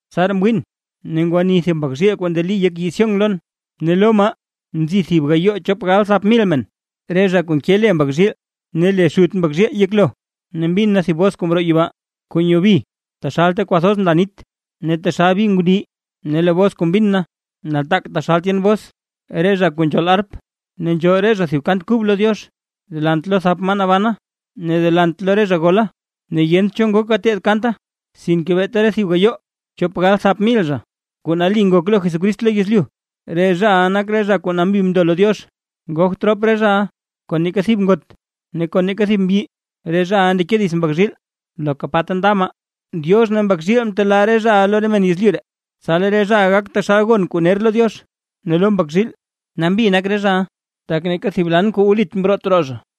Tsaraa mwiin, ne ngwani thib Mbak zhiil kuu ndeli yek yii Sión lon. Ne lo maa nzi thib gayoo chop galbthap mil men, re zha kuu nke le Mbak zhiil ne le Xut Mbak zhiil yeklo. Ne mbin na thib bos kuu mroo yibaa, kuu nyoo bi taxal ta kwathoz nla nit ne taxal bi ngundii; ne lee bos kuu mbin na nataak taxal tyen bos re zha kuu nzhool arp. Ne nzhool re zha thib kant kub lo Diox delant lo thap maa nabana ne delant lo re zha gola. Ne yent cho ngok gateed kanta, sinke beeta re thib gayoo chop gal thap mil zha kuu nali ngok lo Jesucrist lo yezlyu. Re zhaʼa nak re zha kuu nambi mndo lo Diox, ngogt rop re zhaʼa kon neeka thib ngot ne kon neeka thib mbyi, re zhaʼa ndeke dits Mbak zhiil loka pa ta nda maa. Diox ne Mbak zhiil mtelaa re zhaʼa lo re men yezlyu ree, tsa lee re zhaʼa gak taxal gon kuu ner lo Diox ne lo Mbak zhiil. Nambi nak re zhaʼa, tak neeka thib lan diiz kuu wlit mroot roo zha.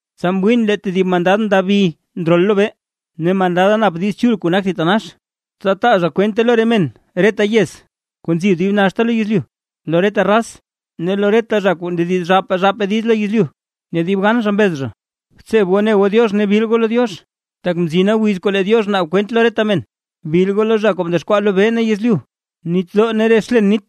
Tsa mwiin lee tedib mandad ndabi ndrol lobee, ne mandada nap Diiz Chul kuu nak thitanax, tsa taa zha kwente lo re men reta yez kuu nzi dib naxta lo yezlyu, lo reta raz ne lo reta zha kuu ndediz zhaapaa zhaapaa diiz lo yezlyu. Ne dib gan zha mbez zha: ―Btseb goo ne goo Diox ne bil goo lo Diox, tak mzina wiz kuu lee Diox naab kwent lo reta men. Bil goo lo zha kuu mdexkwaa lobee ne yezlyu, nitdoo ne re xlen nit.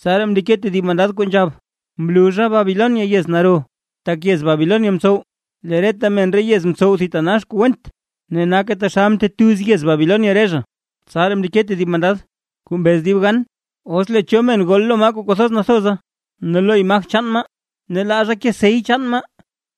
Tsaraa mndeke tedib mandad kuu nzhab: ―¡Mluzha Babilonia, yez naro, tak yez Babilonia mtsow lee reta men re yez mtsow thitanax kuu went, ne nake taxal mtetuz yez Babilonia re zha! Tsaraa mndeke tedib mandad, kuu mbez dib gan: ―Os lee cho men gol lo maa kuu kwathoz nathoza ne lo imaj chaan maa, ne laa zha ke sey chaan maa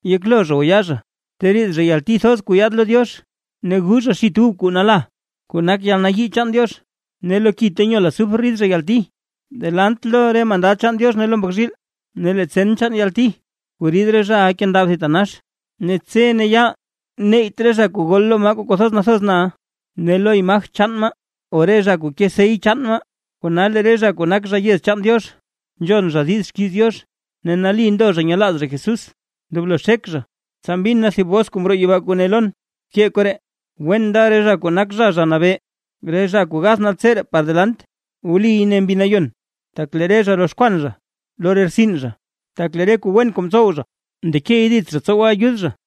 yeklo zha o yaa zha, teriid zhaʼa yalti thoz kuu yaad lo Diox, ne gu zha xit ub kuu nala, kuu nak yalnayii chaan Diox; ne lo ki ta nyol azufre rid zha yalti delant lo re mandad chaan Diox ne lo Mbak zhiil. Ne lee tsen chaan yalti kuu rid re zhaʼa nkendab thitanax. Ne tse ne yaal neyt re zha kuu gol lo maa kuu kwathoz nathoz na ne lo imaj chaan maa, o re zha kuu ke sey chaan maa. Kona, lee re zha kuu nak zha yez chaan Diox, nzhon zha diiz xkiiz Diox, ne nali ndo zha nyelaaz Jesús, ndoblo xek zha. Tsa mbin na thib bos kuu mroo yibaa, kuu ne lon: ―Bkee koree: “Wen nda re zha kuu nak zha, Zha Nabee, re zha kuu gath naltseree par delant”. ―Wliy ―ne Mbi Nayon―, tak lee re zha roxkwan zha lo re rtsin zha, tak lee re kuu wen kuu mtsow zha ndekey dits zha tsowe ayud zha.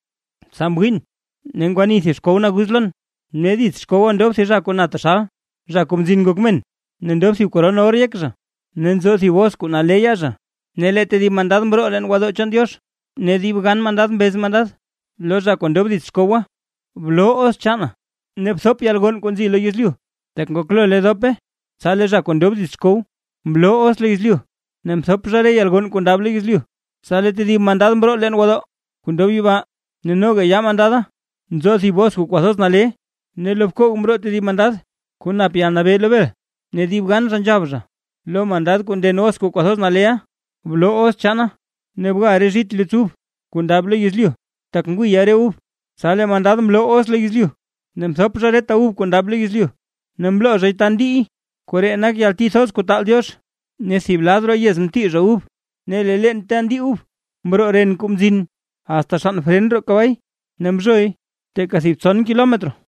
Tsa mwiin, ne ngwani thib xkow naguz lon; ne dits xkowa ndob thib zha kuu na taxal, Zha Kuu Mzin Ngok Men. Ne ndob thib koron or yek zha, ne nzo thib hoz kuu nale yaa zha. Ne lee tedib mandad mroo leen gwodoo chaan Diox, ne dib gan mandad mbez mandad lo zha kuu ndob dits xkowa: ―¡Bloo hoz chaana ne bthop yalgonn kuu nzi lo yezlyu; tak ngoklo lee dope! Tsa lee zha kuu ndob dits xkow mloo hoz lo yezlyu, ne mthop zha re yalgonn kuu ndab lo yezlyu. Tsa lee tedib mandad mroo leen gwodoo kuu ndob yibaa, ne noga yaa mandada nzo thib hoz kuu kwathoz nale. Ne lo bkoog mroo tedib mandad, kuu nap yalnabee lo bel, ne dib gan zha nzhab zha, lo mandad kuu nden hoz kuu kwathoz nale: ―Bloo hoz chaana, ne bga re zhit luts ub kuu ndab lo yezlyu, tak ngwiya re ub. Tsa lee mandad mloo hoz lo yezlyu, ne mthop zha reta ub kuu ndab lo yezlyu, ne mloo zhay ta ndiiy, koree nak yalti thoz kuu taal Diox. Ne thib lad roo yez mtii zha ub, ne lee leen ta ndii ub mroo ren kuu mzin asta xann fren roo kabay, ne mzhoy teeka thib tson kilometro.